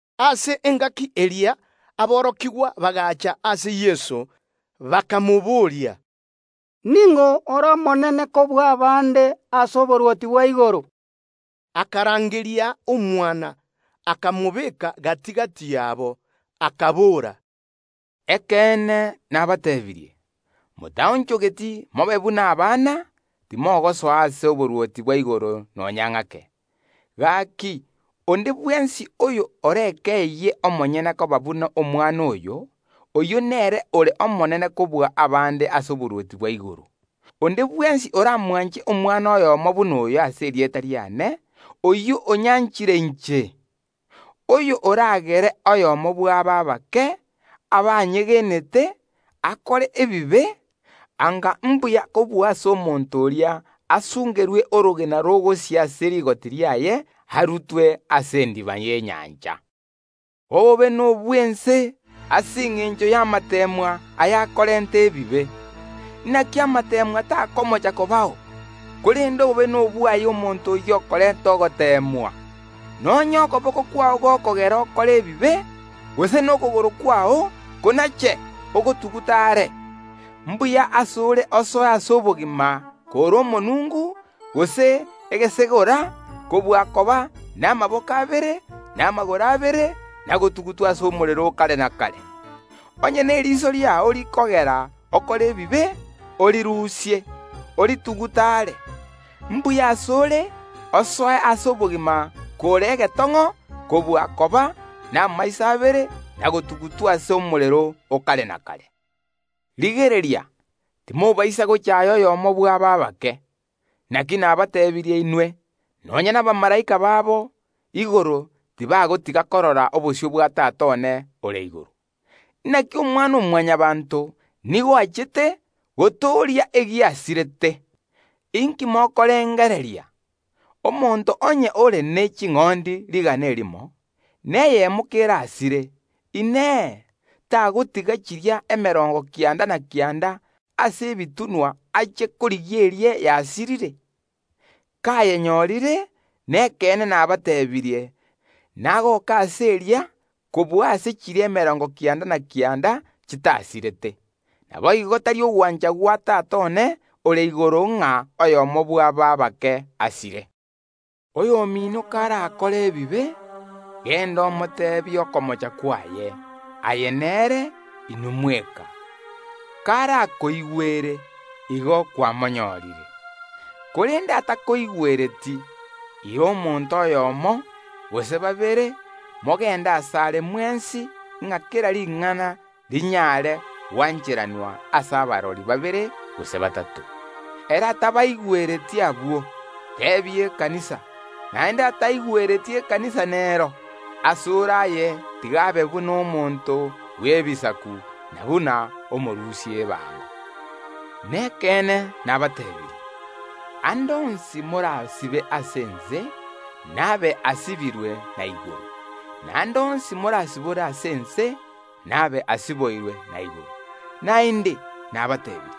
Ase engaki eria aborokigwa bagaacha ase Yeso, bakamobooria, “Ning’o ore omonene kobua abande ase oborwoti bwa igoro?” Akarangeria omwana, akamobeka gati‐gati yaabo, akabora, “Ekeene nabateebirie: Motaonchogeti mobe buna omwana, timogosoa ase oborwoti bwa igoro nonya ng’ake. Gaki, onde bwensi oyo orekeyie omonyene koba buna omwana oyo, oyio nere ore omonene kobua abande ase oborwoti bwa igoro. “Onde bwensi oraariganie omwana oyomo buna oyo ase erieta riane, oyio onyariganirie inche. “Onde bwensi oramochere oyomo bw’aba abake, abanyegenete, anga mbuya kobua ase omonto oria asungerwe orogena rogosia ase rigoti riaye, arutwe ase endiba y’enyancha. “Obobe nobw’ense ase engencho y’amateemwa ayakorenta ebibe! Inaki amateemwa takomocha kobao, korende obobe nobwaye omonto oyio okorenta ogoteemwa! Na onye okoboko kwao gokogera okore ebibe, gose nokogoro kwao, konache, ogotugute are; mbuya ase ore osoe ase obogima kore omonungu, gose egesegora, kobua koba namaboko abere, na amagoro abere, na gotugutwa ase omorero o kare na kare. Onye neriso riao rikogera okore ebibe, orirusie, oritugute are; mbuya ase ore osoe ase obogima kore egetong’o kobua koba namaiso abere na gotugutwa ase omorero o kare na kare. “Rigereria, timobaisa gochaaya oyomo bw’aba abake; naki nabateebirie inwe, nonya nabamalaika babo igoro tibanagotiga korigereria obosio bwa Tata one ore igoro. [ Inaki Omwana‐o‐Mwanyabaanto nigo achete gotooria egiasirete.] “Inki mokorengereria? Omonto obwate ching’ondi rigana erimo, na eyemo kerasire; Inee, tagotiga chiria emerongo kianda na kianda ase ebitunwa, achie korigia eria yasirire? Kayenyorire, nekeene nabateebirie: Nagoke ase eria kobua ase chiria emerongo kianda na kianda chitasirete. Naboigo, tari ogwancha gwa iso oino ore igoro ng’a oyomo bw’aba abake asire. “Oyomino karakore ebibe, genda omoteebie okomocha kwaye, aye nere, inwe mweka. Karagotegerere, igo kwamonyorire. Korende atagotegerereti, ira omonto oyomo, gose babere, mogende asare mwensi, ng’a kera ring’ana rinyare gwancheranwa ase oborori bwa babere gose batato. Ere atabategerereti abwo, teebia ekanisa; naende ataigwereti ekanisa nero, ase ore aye tiga abe buna omonto bw’ense, na buna omorusia ebango. Nekeene nabateebirie: Ande onsi morasibe ase ense, nabe asibirwe na igoro; na ande onsi morasibore ase ense, nabe asiboirwe na igoro. “Naende nabateebirie: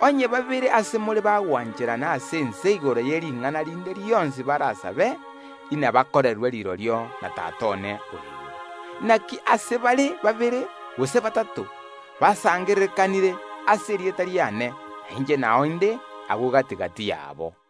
Onye babere ase more bagwancherana ase ense igoro yering’ana rinde rionsi barasabe, inabakorerwe rirorio na Tata one ore igoro. Inaki ase bare babere gose batato basangererekanire ase erieta riane, nainche nao inde agwo gati‐gati yabo.”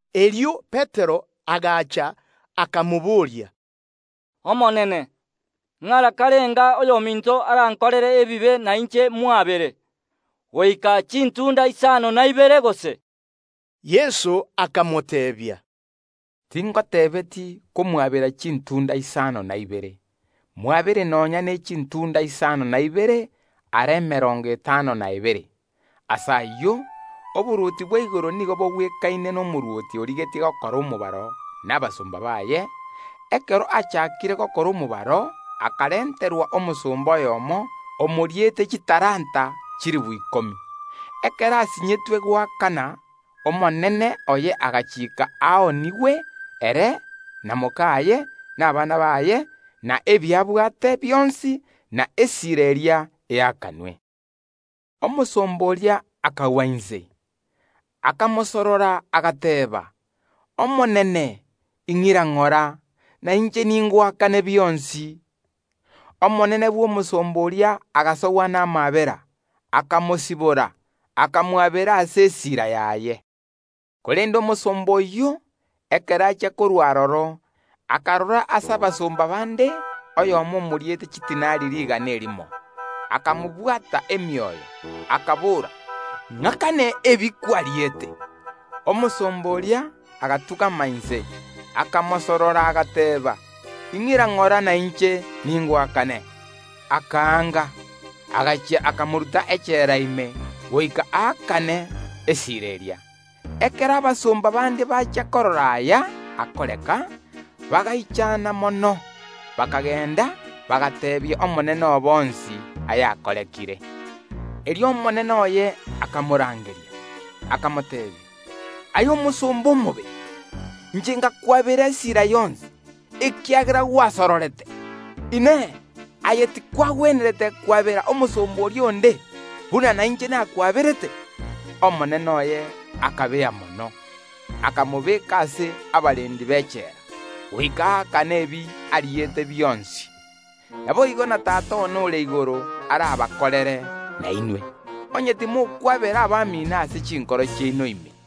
Erio Petero agacha, akamobooria, “Omonene, ng’ara karenga oyominto arankorere bobe, na inche ’mwabere? Ngoika chintunda isano na ibere gose?” Yeso akamoteebia, “Tindi goteeba omwabere chintunda isano na ibere, mwabere nonya ne chintunda isano na ibere ara emerongo etano n’ebere. “Ase ayio, oborwoti bwa igoro nigo bogwekaine nomorwoti origetie gokora omobaro bw’abasomba baye. Ekero achaakire gokora omobaro akarenterwa omosomba oyomo omoriete chitalanta chilifu ikomi. Ekero asinyetwe goakana, omonene oye agachiika aoonigwe, ere na mokaye, na abana baye, na ebi abwate bionsi, na esiira eria eakanwe. Omosomba oria akagwa inse, akamosorora, agateeba: Omonene one, ing’ira ng’ora, na inche ningoakane bionsi. Omonene bw’omosomba oria agasogwa namaabera, akamosibora, akamwabera ase esiira yaye. Korende omosomba oyio, ekero achia korua aroro, akarora ase abasomba bande oyomo omoriete chidinari rigana erimo, akamobwata ebigoti, akabora: Ng’akane ebi kwariete. Omosomba oria agatung’ama inse, akamosorora, agateeba: Ing’ira ng’ora, na inche ningoakane. Akanga, agachia akamoruta echela ime goika aakane esira eria. Ekero abasomba bande bachia korora aya akoreka, bagaichana mono, bakagenda, bagateebia omonene obo onsi ayakorekire. Erio omonene oye akamorangeria, akamoteebia: Aye omosomba omobe! Inche ngakwabera esira yonsi, ekiagera gwansororete. Inee! Aye tikwagwenerete kwabera omosomba oria onde, buna nainche nakwaberete? Omonene oye akabea mono, akamobeka ase abarendi b’echela, goika aakane ebi ariete bionsi. Naboigo na Tata one ore igoro arabakorere nainwe, onye timokwabera abamino ase chinkoro chiaino ime.”